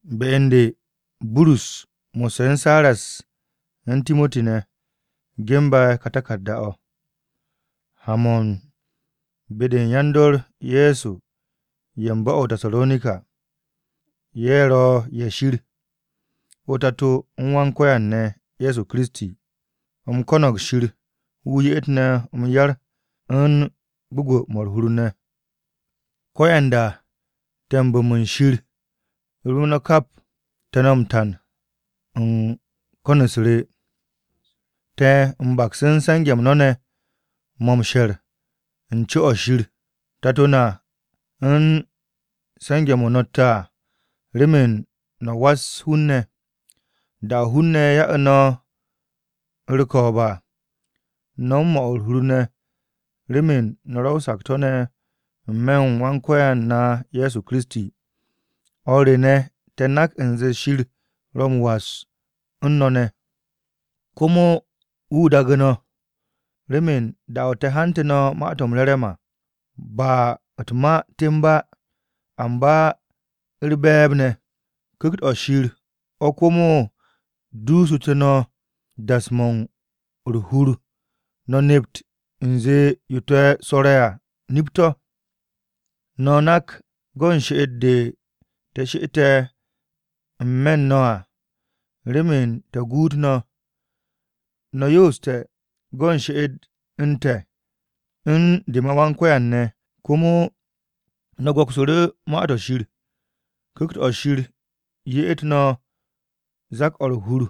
Be u̱n de Burus mo̱sse̱ u̱n Siras u̱n Timoti ne̱, ge̱nbe̱ ka taku̱rda-o̱, ha-mo̱ u̱n be-de u̱n yan-dor Ye̱so ye̱ u̱n bo̱-o̱ o-Tasaronika, ye̱ ro̱ ye̱ Shir, o-Tato u̱n Wan-Ko̱yan ne̱ Ye̱so Kiristi. U̱m ko̱no̱g Shir wu̱ ye'et no̱ m-yar u̱n gwu̱gwu̱-mo̱ u̱r-hur ne̱. Ko̱yanda te̱ m-bo̱mu̱ u̱n Shir rem no̱ kap, te̱ no̱ m-tan u̱n ko̱n-u̱s te̱. Te̱ m-baks u̱n se̱nge̱-m no̱ ne̱ mo̱ m-she̱r u̱n co-o̱ Shir Tato na u̱n se̱nge̱-mo̱ no̱tte̱ à remen no̱ was hun-ne̱. Da-o̱ hun-ne̱ ya'u̱ no̱ u̱r-ko̱o̱b à, no̱ u̱n 'mo̱ u̱r-hur ne̱ remen no̱ ro̱ o-sakto̱ ne̱ n-me̱ u̱n Wan-Ko̱yan na Ye̱so Kiristi. O̱r te̱ ne̱, te̱ nak u̱nze Shir ro̱ m-was no̱ ne̱, komo wu̱ daagu̱ no̱. Remen da-o̱ te̱ hantu̱ no̱ Ma-to̱ m-Re̱re̱m à, ba u̱t-ma temb á, amba u̱r-be̱e̱b ne̱. Ku̱kt-o̱ Shir o̱ komo dossu̱te̱ no̱ das-mo̱ u̱r-hur no̱ nept u̱nze yo te̱ rwo̱re̱ à nip-to̱. No̱ nak go̱n she'et-de te̱ she'ete̱ n-me̱ u̱n no̱ à remen te̱ guut no̱. No̱ yooste̱ go̱n she'et u̱n te̱ u̱n de ma Wan-Ko̱yan ne̱ komo, no̱ go̱ksu̱ru̱ Ma-to̱ Shir; Ku̱kt-o̱ Shir ye'et no̱ zak-o̱ u̱r-hur,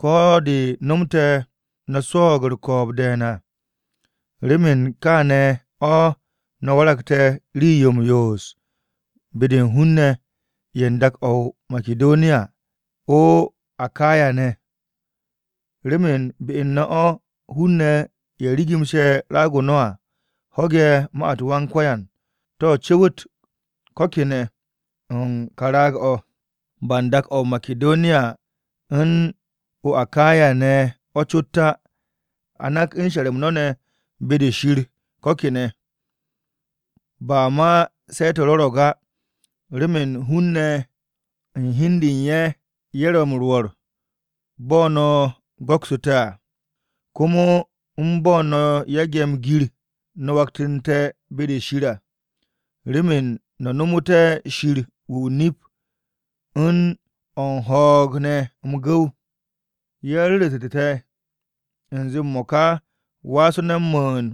ko̱ de̱ no̱mte̱ no̱ swo̱o̱g u̱r-ko̱o̱b de̱e̱n à. Remen u̱n kaane̱ o̱ no̱ waragte̱ rii-yo u̱r-yoos be-de u̱n hun-ne̱ ye̱ u̱n dak-to̱ o-Makidoniya o-Akaya ne̱. Remen be u̱n no̱ o̱, hun-ne̱ ye̱ rigimse̱ raag-o no̱ à ho̱ge̱ ma-u̱t Wan-Ko̱yan to̱ cu̱wu̱t ko̱ kene̱ u̱n ka raag-o̱, ba u̱n dak-to̱ o-Makidoniya u̱n o̱ o-Akaya ne̱ o̱ cot á. A nak u̱n she̱r-m no̱ ne̱ be-de Shir ko̱ kene̱, ba ma se̱ te̱ rwo̱ro̱g á. Remen hun-ne̱ u̱n hi u̱n de u̱n ye̱, ye̱ ro̱ m-rwo̱r bo̱ no̱ go̱ksu̱ te̱ à. Komo u̱n bo̱ no̱ yage̱ m-gir, no̱ waktu̱nte̱ be-de Shir à, remen no̱ nomu̱té̱ Shir wu̱ o-nip u̱n o̱ u̱n ho̱o̱g ne̱ m-gu̱w. Ye̱ ru̱ru̱tu̱ te̱ u̱nze m-mo̱ka waase̱ no̱ m-mu̱u̱n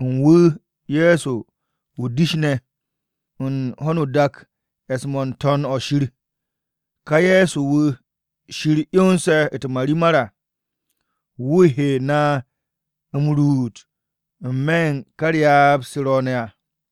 mo̱ u̱n Wà u̱n wu̱ Ye̱so o-dish ne̱ u̱n ho̱no o-dak e̱s-mo̱ n-To̱n o-shir. Ká Ye̱so wu̱ Shir 'yonse̱ u̱t-marimar à, wu̱ he na m-ruut n-me̱ u̱n ka ryaab-se ro̱o̱ne̱ à.